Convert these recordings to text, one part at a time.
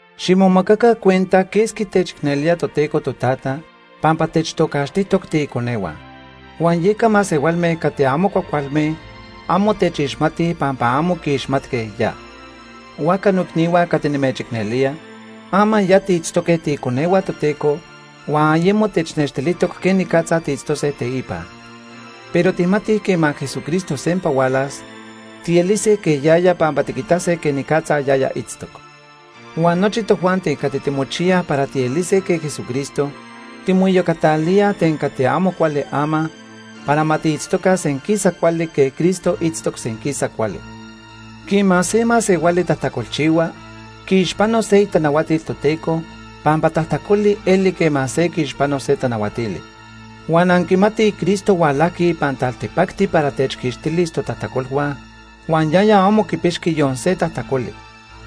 Ximomacaca cuenta quesqui techicnelía Toteco Totata pampa techtocaxtijtoc tiiconehua. Huan yeca masehualme cati amo cuajcualme amo techixmatij pampa amo quiixmatque ya. Huajca noicnihua cati nimechicnelía, ama ya tiitztoque tiiconehua Toteco, huan ayemo technextilijtoc quenicatza tiitztose teipa. Pero tijmatij quema Jesucristo sempa hualas, tielise quej yaya pampa tiquitase quenicatza yaya itztoc. Huan nochi tojuanti cati timochiyaj para tielise quej Jesucristo timoiyocatalíaj ten cati amo cuali ama, para ma tiitztoca senquisa cuali quej Cristo itztoc senquisa cuali. Quema se masehuali tajtacolchihua, quiixpano se itanahuatil Toteco, pampa tajtacoli eli quema se quiixpano se tanahuatili. Huan anquimatij Cristo hualajqui ipan taltipacti para techquixtilis totajtacolhua, huan yaya amo quipixqui yon se tajtacoli.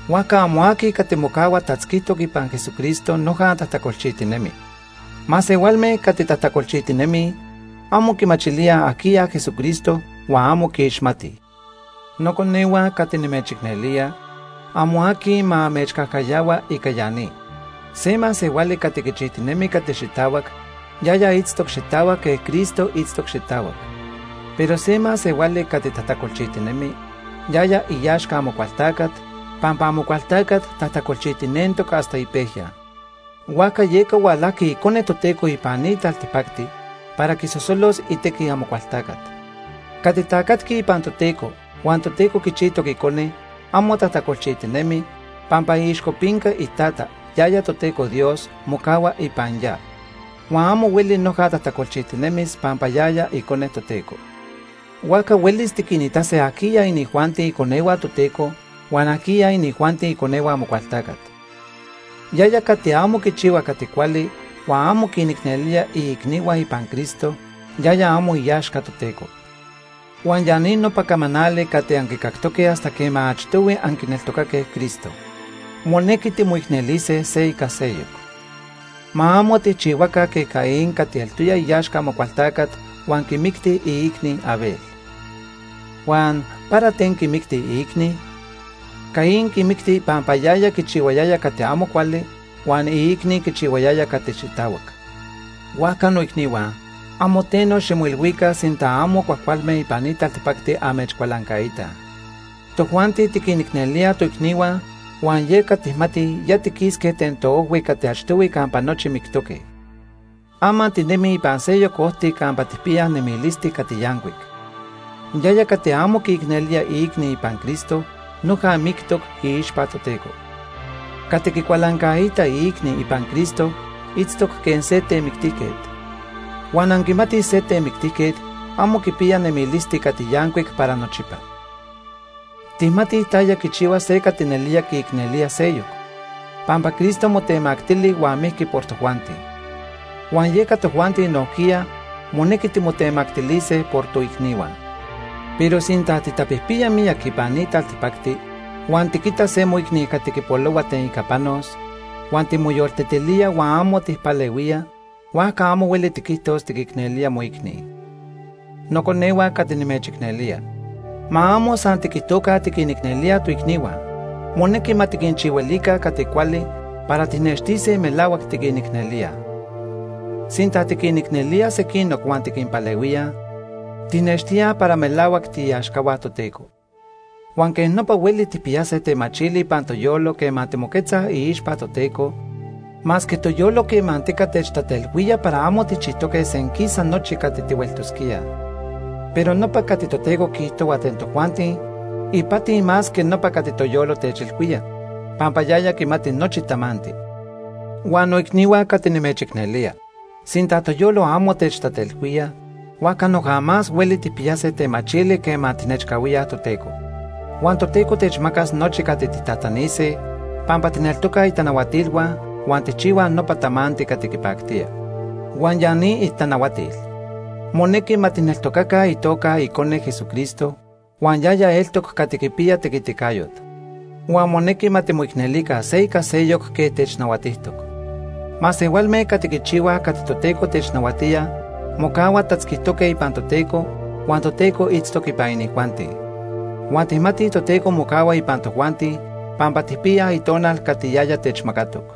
Huajca amo aqui cati mocahua tatzquitoc ipan Jesucristo noja tajtacolchijtinemi. Masehualme cati tajtacolchijtinemij amo quimachilíaj ajquiya Jesucristo huan amo quiixmatij. Noconehua cati nimechicnelía, amo aqui ma amechcajcayahua ica ya ni. Se masehuali cati quichijtinemi cati xitahuac, yaya itztoc xitahuac quej Cristo itztoc xitahuac. Pero se masehuali cati tajtacolchijtinemi, yaya iaxca Amocualtacat, pampa Amocualtacat tajtacolchijtinentoc hasta ipejya. Huajca yeca hualajqui Icone Toteco ipan ni taltipacti para quisosolos itequi Amocualtacat. Cati tacatqui ipan Toteco huan Toteco quichijtoc icone amo tajtacolchijtinemi, pampa iixcopinca iTata, yaya Toteco Dios, mocahua ipan ya. Huan amo hueli noja tajtacolchijtinemis pampa yaya icone Toteco. Huajca huelis tiquinitase ajquiya inijuanti iconehua Toteco huan ajquiya inijuanti iconehua Amocualtacat. Yaya cati amo quichihua cati cuali huan amo quinicnelía iicnihua ipan Cristo, yaya amo iaxca Toteco. Huan ya ni nopa camanali cati anquicactoque hasta quema achtohui anquineltocaque Cristo: monequi timoicnelise se ica seyoc. Ma amo tijchihuaca quej Caín cati eltoya iaxca Amocualtacat huan quimicti iicni, Abel. Huan ¿para ten quimicti iicni? Caín quimicti pampa yaya quichihuayaya cati amo cuali huan iicni quichihuayaya cati xitahuac. Huajca noicnihua, amo teno ximoilhuica sinta amo cuajcualme ipan ni taltipacti amechcualancaitaj. Tojuanti tiquinicnelíaj toicnihua, huan yeca tijmatij ya tiquisque ten toojhui cati achtohui campa nochi mictoque. Ama tinemij ipan seyoc ojti campa tijpiyaj nemilisti cati yancuic. Yaya cati amo quiicnelía iicni ipan Cristo noja mictoc iixpa Toteco. Cati quicualancaita iicni ipan Cristo itztoc quej se temictijquet. Huan anquimatij se temictijquet amo quipiya nemilisti cati yancuic para nochipa. Tijmatij taya quichihua se cati nelía quiicnelía seyoc, pampa Cristo motemactili huan mijqui por tojuanti. Huan yeca tojuanti nojquiya, monequi timotemactilise por toicnihua. Pero sinta titapijpiya miyac ipan ni taltipacti, huan tiquita se moicni cati quipolohua ten ica panos, huan timoyoltetilía huan amo tijpalehuía, huajca amo hueli tiquijtos tiquicnelía moicni. Noconehua cati nimechicnelía, ma amo san tiquijtoca tiquinicnelíaj toicnihua, monequi ma tiquinchihuilica cati cuali para tijnextise melahuac tiquinicnelíaj. Sinta tiquinicnelíaj sequinoc huan tiquinpalehuíaj, tijnextíaj para melahuac tiiaxcahua Toteco. Huan quej nopa hueli tijpiyase temachili ipan toyolo quema timoquetzaj iixpa Toteco, masque toyolo quemantica techtatelhuía para amo tijchijtoque senquisa nochi cati tihueltosquíaj. Pero nopa cati Toteco quiijtohua ten tojuanti ipati más que nopa cati toyolo techilhuía, pampa yaya quimati nochi tamanti. Huan noicnihua cati nimechicnelía, sinta toyolo amo techtatelhuía, huajca noja más hueli tijpiyase temachili quema tijnechcahuíaj Toteco. Huan Toteco techmacas nochi cati tijtajtanise pampa tijneltocaj itanahuatilhua huan tijchihuaj nopa tamanti cati quipactía. Huan ya ni itanahuatil: Monequi ma tijneltocaca itoca O itequiticayo. Icone, Jesucristo, huan yaya eltoc cati quipiya tequiticayot. Huan monequi ma timoicnelica se ica seyoc quej technahuatijtoc. Masehualme cati quichihuaj cati Toteco technahuatía mocahuaj tatzquitoque ipan Toteco huan Toteco itztoc ipan inijuanti. Huan tijmatij Toteco mocahua ipan tojuanti pampa tijpiyaj Itonal cati yaya techmacatoc.